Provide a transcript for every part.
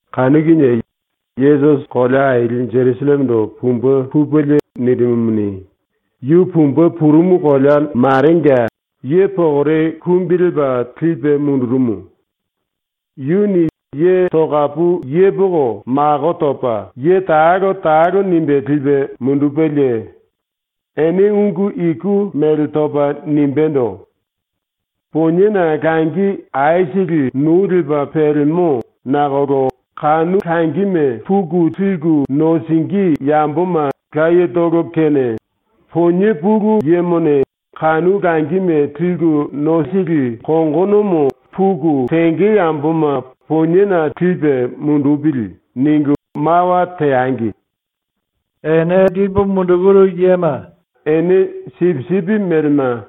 Kanu kinie Yesusi kolea aili Jerusallemendo pumbe pupelie nirimumuni, yu pumbe purumu kolea marenga ye pokore kumbi lepa lipe mundurumu. Yuni ye tokapu yepoko mako topa ye talo talo nimbe lipe mundupelie ene ungu iku mele topa nimbendo: “Poniena langi aisili nou lepa pelemo nakolo kanu langime puku liku nosingí yamboma layetolo kene Ponie Pulu Yemone ‘Kanu langime liku nosili kongonomo puku tenge yamboma poniena lipe mundupili.’ ningu mawa teangi. Ene lipu mundukuru yema ene sipisipi melema,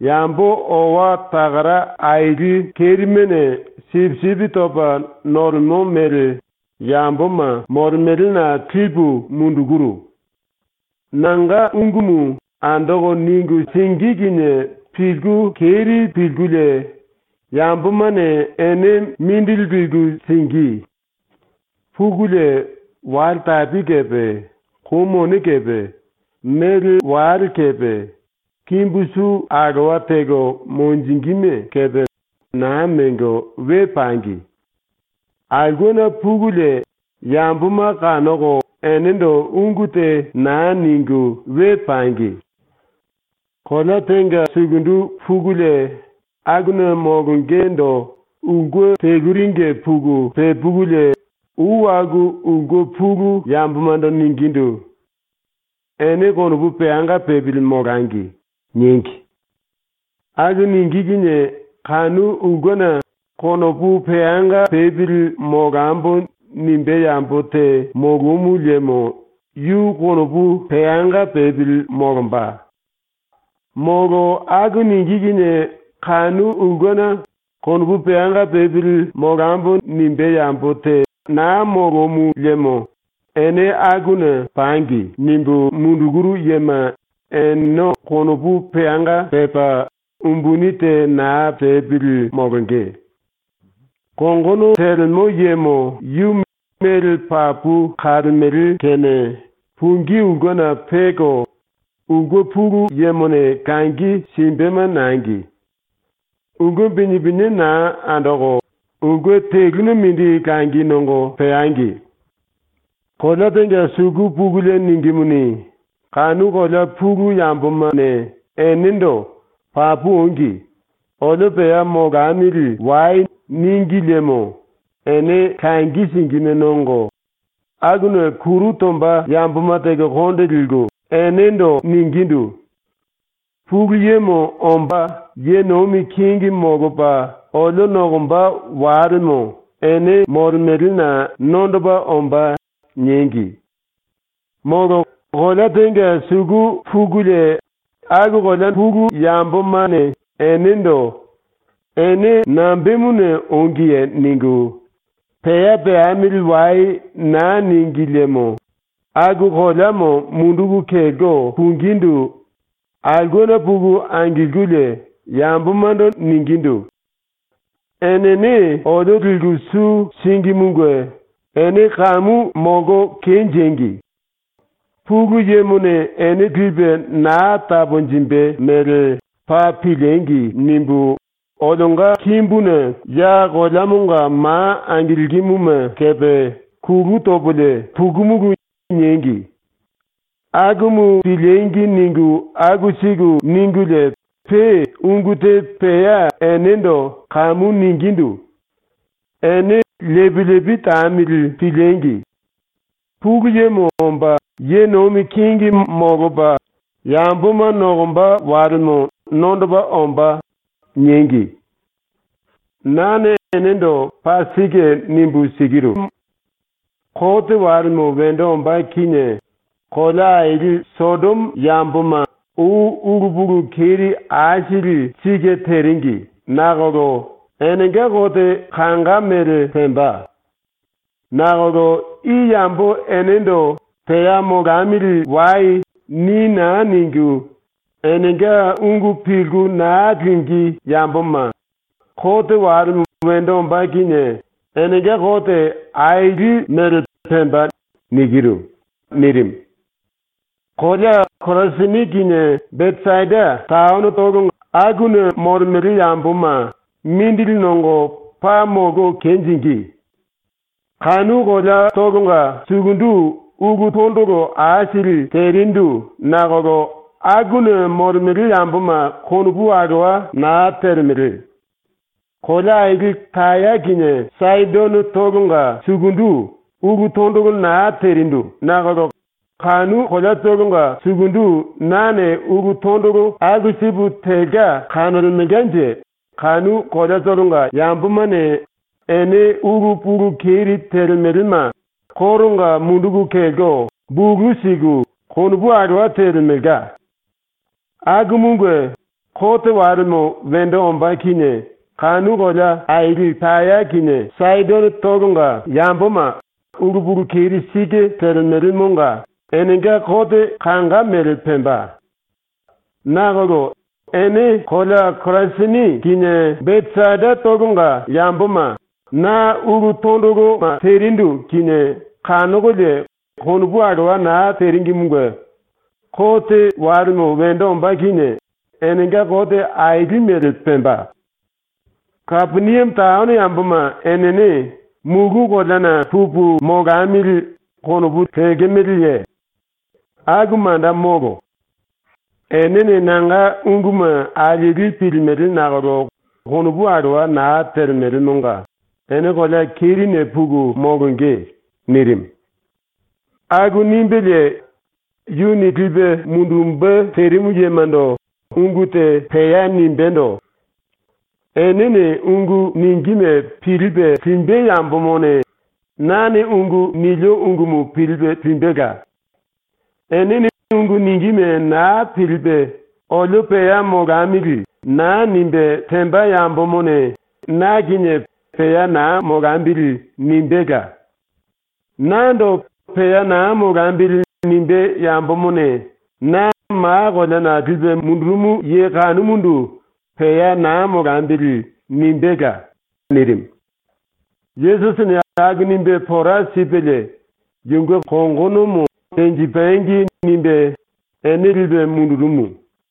yambo owa takara aili kerimene sipisipi topa nolemo mele yamboma molemelena lipu mundukuru. ⸤Nanga ungumu andoko ningu singí kinie pilku keri pilkulie yambomane ene mindili liku singí.⸥ Pukulie, wale tapi kepe, kou mone kepe, mele wale kepe, kimbu su alowa teko monjingíme kepe naa mengo we pangi. Aulkena pukulie yamboma kanoko enendo ungu te naa ningu we pangi. “Kolea tenga sukundu pukulie akuna molongendo ulke teluringe puku pepukulie ou aku ulke pulu yambomando ningindu: “Ene konopu peanga pepili molangi.” niengi. Aku ningí kinie kanu ulkena ‘Konopu peanga pepili molambo.’ nimbé yambo te molomu liemo yu konopu peanga pepili molomba. Molo aku ningí kinie kanu ulkena ‘Konopu peanga pepili molambo.’ nimbé yambo te naa molomu liemo ene akuna ‘Pangi.’ nimbu mundukuru yema eneno konopu peanga pepa umbuni te naa tepili molonge. Kongono telemo yemo yu mele papu kalemele kene pungí ulkena peko, ulke pulu yemone langi simbema nangi. Ulke pinie pinie naa andoko, ulke teluna mindi langi nongo peangi. “Kolea tenga suku pukulie ningímuni, kanu kolea pulu yambomane enendo “Papu ongi. Olio pea molamili wai.” níngi liemo ene langi singíme nongo, akuna kuru tomba yamboma teko konde liku, enendo ningindu: “Pulu Yemo omba ye nomi kingi molopa olio nokomba walemo ene molemelena nondopa ombá.” niengi. “Molo kolea tenga suku pukulie aku kolea pulu yambomane enendo “Ene nambemuna ongiye?” ningu, “Pea peamili wai.” naa níngi liemo ⸤aku koleamo munduku kelko pungindu⸥ aulkena puku angilkulie yambomando ningindu: “Enene olio liku su síngimunge ‘Ene kamu molko kenjengi! Pulu Yemone ene lipe naa taponjimbe mele paa piliengi!’ nimbu, olionga kimbuna ya koleamonga ma angilkimuma kepe kulu topolie pukumulu.” niengi. ‘Akumu piliengi!’ ningu aku siku ningulie pe ungu te pea enendo kamu ningindu: “⸤Ene lepi lepi tamili piliengi!⸥ Pulu Yemo omba ye nomi kingi molopa yamboma nokomba walemo nondopa ombá.” niengi. “Nane enendo paa sike nimbu sikirumu: Kote walemo wendo ombá kinie kolea aili Sodomo ⸤yamboma ou ulu pulu keri aisili sike teringi nakolo⸥ enenga kote kanga mele pemba. Nakolo i yambo ⸤enendo “Pea molamili wai.” ni naa ningu, enenga ungu pilku naa lingí yamboma,⸥ kote walemo wendo ombá kinie enenga kote aili mele pemba.” nirimu. “Kolea Korasini kinie Besaida taonotolo ⸤akuna molemele yamboma⸥ mindili nongo paa molko kenjingí. Kanu koleatolonga sukundu ulu tondolo aisili terindu ⸤nakolo akuna molemele yamboma konopu alowa naa telemele⸥. Kolea aili Taya kinie Saidonotolonga sukundu ulu tondolo naa terindu nakolo kanu koleatolonga sukundu nane ulu tondolo aku sipu telka kanolemelkanje kanu koleatolonga ⸤yambomane⸥ ene ulu pulu keri telemelema koronga munduku kelko, bulu siku, konopu alowa telemelka. ⸤Akumunge⸥ kote walemo wendo ombá kinie kanu kolea aili Taya kinie Saidonotolonga ⸤yamboma ulu pulu keri sike telemelemonga⸥ enenga kote kanga mele pemba. Nakolo ene kolea Korasini kinie Besaidatolonga ⸤yamboma⸥ ⸤na ulu tondoloma terindu kinie kanokolie konopu alowa naa teringimunge⸥ kote walemo wendo ombá kinie enenga kote aili mele pemba. “Kapeniame taono ⸤yamboma enene⸥ ‘Mulu koleana pupu molamili.’ konopu lekemeleye? Aku manda molo. ⸤Enene nanga unguma alieli pilimele nakolo konopu alowa naa telemelemonga⸥ ene kolea kerine puku molonge.” ⸤nirimu.⸥ ⸤Aku nimbelie yuni lipe mundumbe terimu yemando ungu te pea nimbendo:⸥ “Enene ungu ningíme pilipe limbe yambomone nane ungu nilio ungumu pilipe limbela. Enene ungu ningíme naa pilipe ‘Olio pea molamili.’ naa nimbe temba yambomone na kinie ‘Pea naa molambili.’ nimbéla. Nando ‘Pea naa molambili.’ nimbé yambomone na ma koleana lipe mundurumu ye kanumundu ‘Pea naa molambili.’ nimbéla.” nirimu. Yesusini aku nimbe pora sipelie ‘Yunge kongono tenjipangi.’ nimbe ene lipe mundurumu.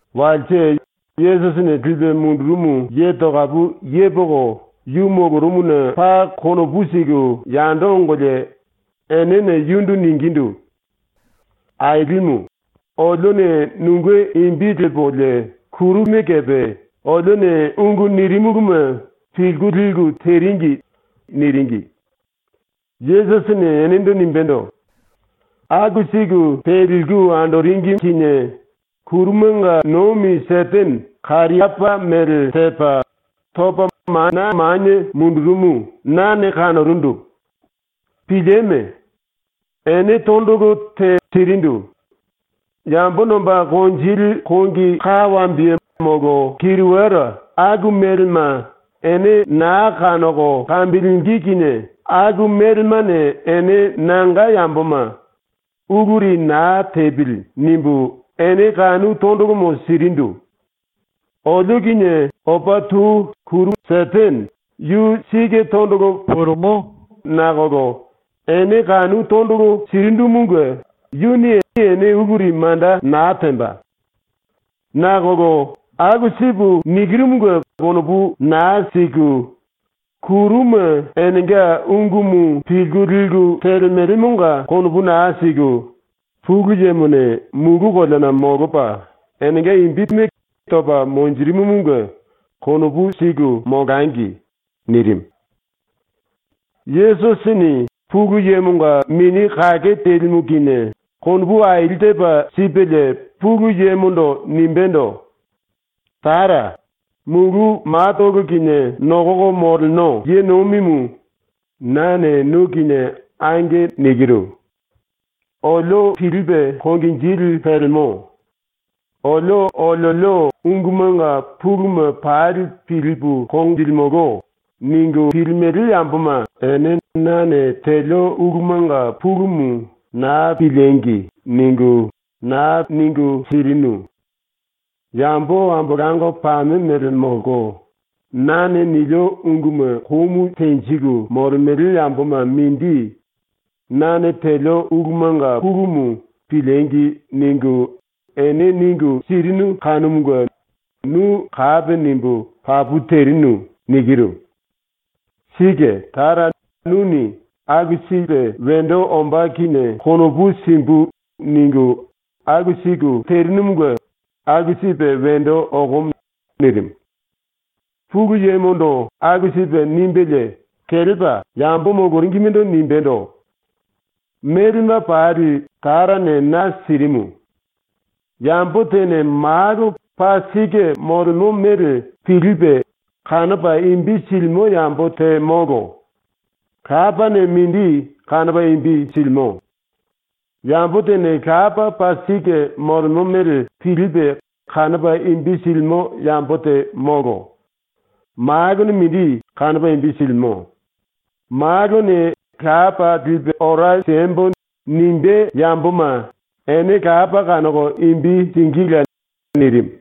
⸤Walse⸥ Yesusini lipe mundurumu ye tokapu yepoko yu molorumuna paa konopu siku yando ongolie enene yundu ningindu: “Ailimu, olione nunge imbi lepolie kuru kerime kepe olione ungu nirimuluma pilku liku teringi.” niringi. Yesusini enendo nimbendo: “Aku siku teliku andoringi kinie ⸤kurumanga nomi⸥ Setene kariapá mele tepa, topa manie mundurumu nane kanorundu, Pilieme! Ene tondolo te sirindu. Yambo nomba konjili kongi ka wambiye molo kiriwara aku melema ene naa kanoko kambilingí kinie aku melemane ene nanga yamboma ‘Uluri naa tepili.’ nimbu ene kanu tondolomo sirindu. Olio kinie opa tou ⸤Setene⸥ yu sike tondolo pulimo nakolo ene kanu tondolo sirindumunge yuni ene uluri manda naa temba. Nakolo aku sipu nikirumunge konopu naa siku, kuruma enenga ungumu pilku liku telemelemonga konopu naa siku; ⸤Pulu Yemone⸥ mulu koleana ⸤molopa⸥ enenga imbime topa monjirimumunge konopu siku molangi.” nirimu. Yesusini Pulu Yemonga Mini Kake Telimu kinie konopu aili tepa sipelie Pulu Yemondo nimbendo: “Tara, Mulu Matolo Kinie Nokoko Moleno Ye Nomimu, nane nu kinie “Ange.” nikiru. ‘Olio pilipe konginjili pelemo. Olio oliolio ungumanga puluma pali pilipu konjilimolo.’ ningu pilimele yamboma ene nane telio ulumanga pulumu ‘Naa piliengi!’ ningu naa ningu sirinu. Yambo ambolango pame ⸤mele⸥ molko, nane nilio unguma komu tenjiku molemele yamboma mindi nane telio ulumanga pulumu ‘Piliengi!’ ningu, ene ningu sirinu kanumunge nu kapi nimbu “Papu terinu.” nikiru. Sike Tara, nuni ‘aku sipe wendo ombá kinie konopu simbu.’ ningu aku siku terinumunge ⸤aku sipe wendo okomo.⸥” nirimu. ⸤Pulu Yemondo aku sipe nimbelie kelepa yambo moloringimendo nimbendo:⸥ “Melema pali Tarane na sirimu. Yambo tene Malo paa sike molemo mele pilipe kanopa imbi silimo yambo te molo; Lapane mindi kanopa imbi silimo. Yambo tene Lapa paa sike molemo mele pilipe kanopa imbi silimo yambo te molo. Malone mindi kanopa imbi silimo; Malone ‘Lapa lipu ora siembo.’ nimbé yamboma ene Lapa kanoko imbi singíla.” nirimu.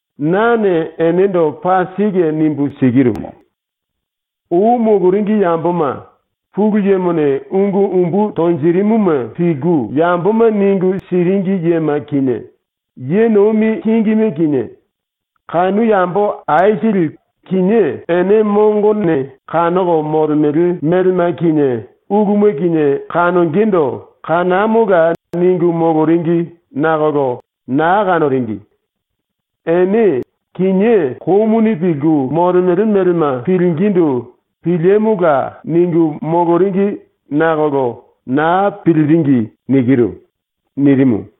Nane enendo paa sike nimbu sikirumu: Ou moloringi yamboma, Pulu Yemone ungu umbu tonjirimuma pilku yamboma ningu siringi yema kinie, ye nomi kingime kinie, kanu yambo aisili kinié ene mongone kanoko molemele melema kinie uluma kinie kanongendo “Kanamola!” ningu moloringi nakolo naa kanoringi. Ene kinié komuni pilku molemele melema pilingindu “Piliemola!” ningu moloringi nakolo naa piliringi.” nirimu.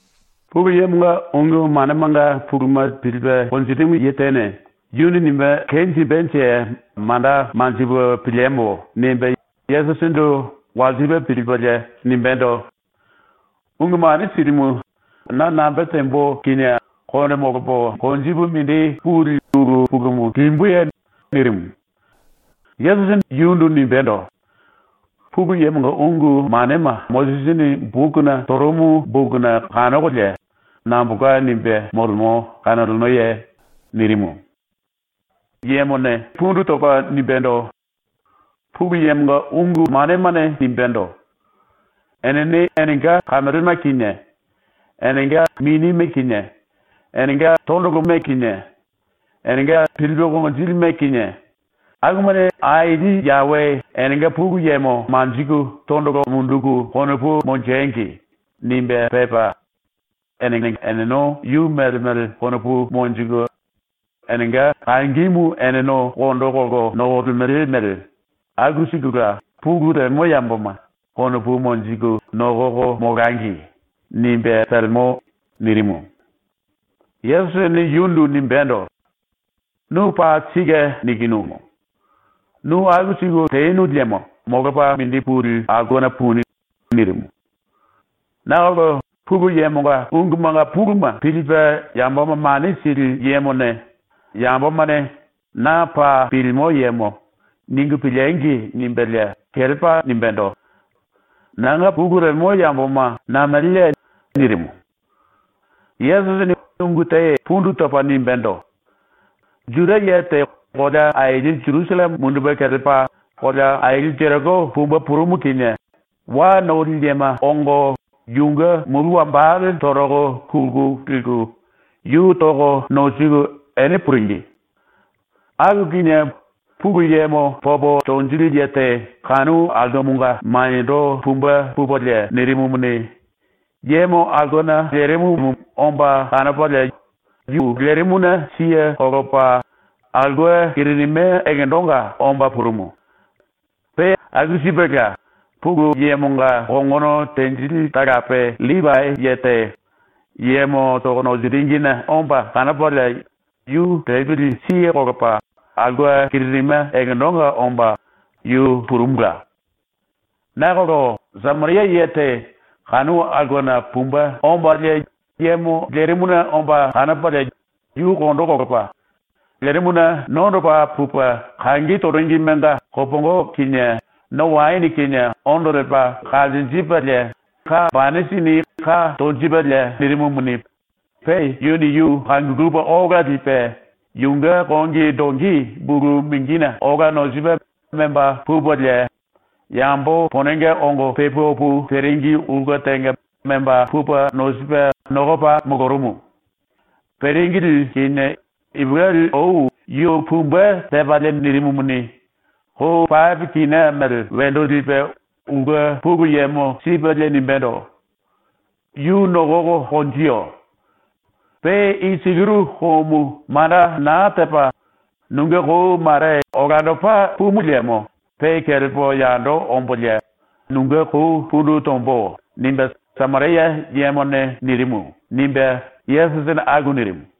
Pulu Yemonga ungu manemanga puluma pilipe konjirimu ye tene ‘Yuni nimbe kenjimbenje manda manjipu piliembo.’ nimbe Yesusindu walsipe pilipelie nimbendo: “Ungu Mane Silimu, na nambe tembo kinie konde molopo konjipu mindi puli ulu pulumu limbuye?” nirimu. Yesusini yundu nimbendo: “Pulu Yemonga ungu manema Mosisini bokuna torumu bokuna kanokolie nambolka nimbe molemo kanolenoye?” nirimu. Yuni pundu topa nimbendo: “Pulu Yemonga ungu manemane nimbendo: ‘Enene enenga kamelema kinie, enenga minime kinie, enenga tondolomo kinie, enenga pilipe konginjilime kinie, akumane Aili Yawe enenga Pulu Yemo manjiku tondolo munduku konopu monjengi.’ nimbe pepa, ‘Enene eneno yu mele mele konopu monjiku enenga kangimu eneno kondo kolko nokolemele mele aku sikula pulu lemo yamboma konopu monjiku nokoko molangi.’ nimbe pelemo.” nirimu. Yesusini yundu nimbéndo: “Nu paa sike nikinumu. Nu aku siku tenu liemo molopa mindi puli aulkena puni.” nirimu. Nakolo Pulu Yemonga ungumanga puluma pilipe yamboma mane sili yemone ‘Yambomane ‘Na paa pilimo yemo’ ningu piliengi!’ nimbelie kelepa nimbendo: “Nanga pulu lemo yamboma nameleye?” nirimu. Yesusini ungu te pundu topa nimbendo: “Juda ye te kolea aili Jerusalleme mundupe kelepa kolea aili Jeriko pumbe purumu kinie wa noli yema ongo yunge mulu wambale toroko kulku liku yu toko nosiku ene puringi. Kanu kinie Pulu Yemo popo tonjili ye te kanu aulkemonga maniendo pumbe pupelie nirimumuni, yemo aulkena lerimumu omba kanopalie yu lerimuna siye kolopa aulke kiririme ekendonga omba purumu. Pe aku sipela Pulu Yemonga kongono tenjili talape LLipai ye te yemo toko nosiringine omba kanopalie yu lepili siye kolopa aulke kiririme ekendonga omba yu purumula. Nakolo Sameria ye te kanu aulkena pumbe ombalie yemo lerimuna omba kanopalie yu kondo kolopa, lerimuna nondopa pupe kangi toringimenga kopongo kinie no waene kinie ondo lepa kanjinjipelie banisini ka tonjipelie nirimumuni, pe yuni yu kangulupe ola lipe yunge kongi dongi bulu mingine ola nosipe memba pupelie yambo ponenge ongo pe pu opu teringi ulke tenga memba pupe nosipe nokopa molorumu. Peringili kinie ipulueli ou yu pumbe tepalie nirimumuni, kou pape kina mele wendo lipe ulke pulu yemo sipelie nimbendo: “Yu nokoko konjiyo. Pe i sikiru koumu manda naa tepa nunge kou mare olandopa pumu liemo pe kelepo yando ombolie nunge kou pundu tombo.” nimbe Sameria yemone nirimu.” ⸤nimbe Yesusini aku nirimu.⸥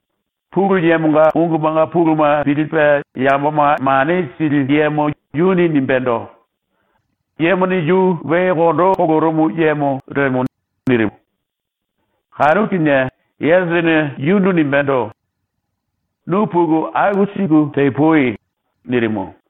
Pulu Yemonga ungumanga puluma pilipe yamboma mane sili yemo yuni nimbendo: “Yemone yu we kondo kolorumu yemo lemo.” nirimu. Kanu kinie Yesusini yundu nimbendo: “Nu puku aku siku tepui.” nirimu.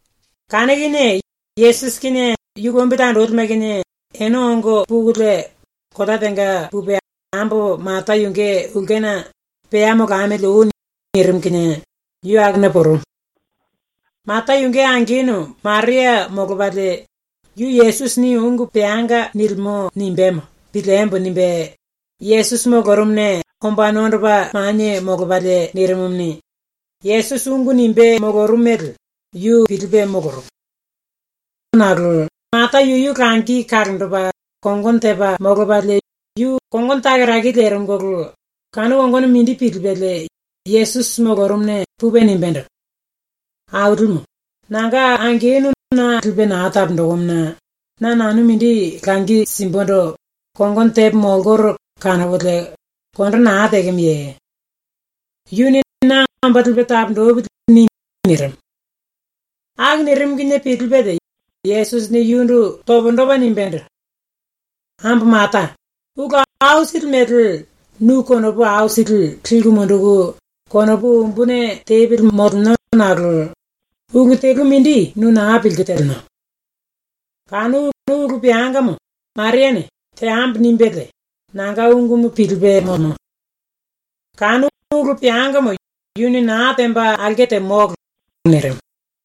Kanu kinie Yesusi kinie yu lombili andolime kinie ene ongo pukulie kolea tenga pupe ambo Mata yunge ulkena “Pea molamili oi.” nirimu kinie yu akuna purumu. Mata yunge angenu Maria molopalie yu Yesusini ungu peanga nilimo nimbémo ‘Piliembo.’ nimbe Yesusi molorumuna omba nondopa manie molopalie nirimumuni, Yesusi ungu nimbe molorumu mele yu pilipe molorumu. Nakolo Mata yuyu langi kalonjipe, kongono tepa molopalie yu kongono takaraki lerimuna kanu kongonomo mindi pilipelie Yesusi molorumuna pupe nimbendo: “Ailimu, nanga angenu na lipe naa taponjikimuna na nanu mindi langi simbundu kongono tepo molkoro kanokolie kondo naa tekemoye? Yuni na ‘Omba lipe taponjipili.’ ni.” nirimu. Aku nirimu kinie pilipelie Yesusini yundu pundu topa nimbendo: “Ambo Mata, ulu aisili mele nu konopu aisili liku munduku konopu umbuni tepili moleno nakolo ulu telu mindi nu naa pilku teleno. Kanu ulu peangamo Mariane ‘Teambo.’ nimbelie ⸤nanga ungumu pilipe⸥ molemo. Kanu ulu peangamo yuni naa temba aulke te molo.” nirimu.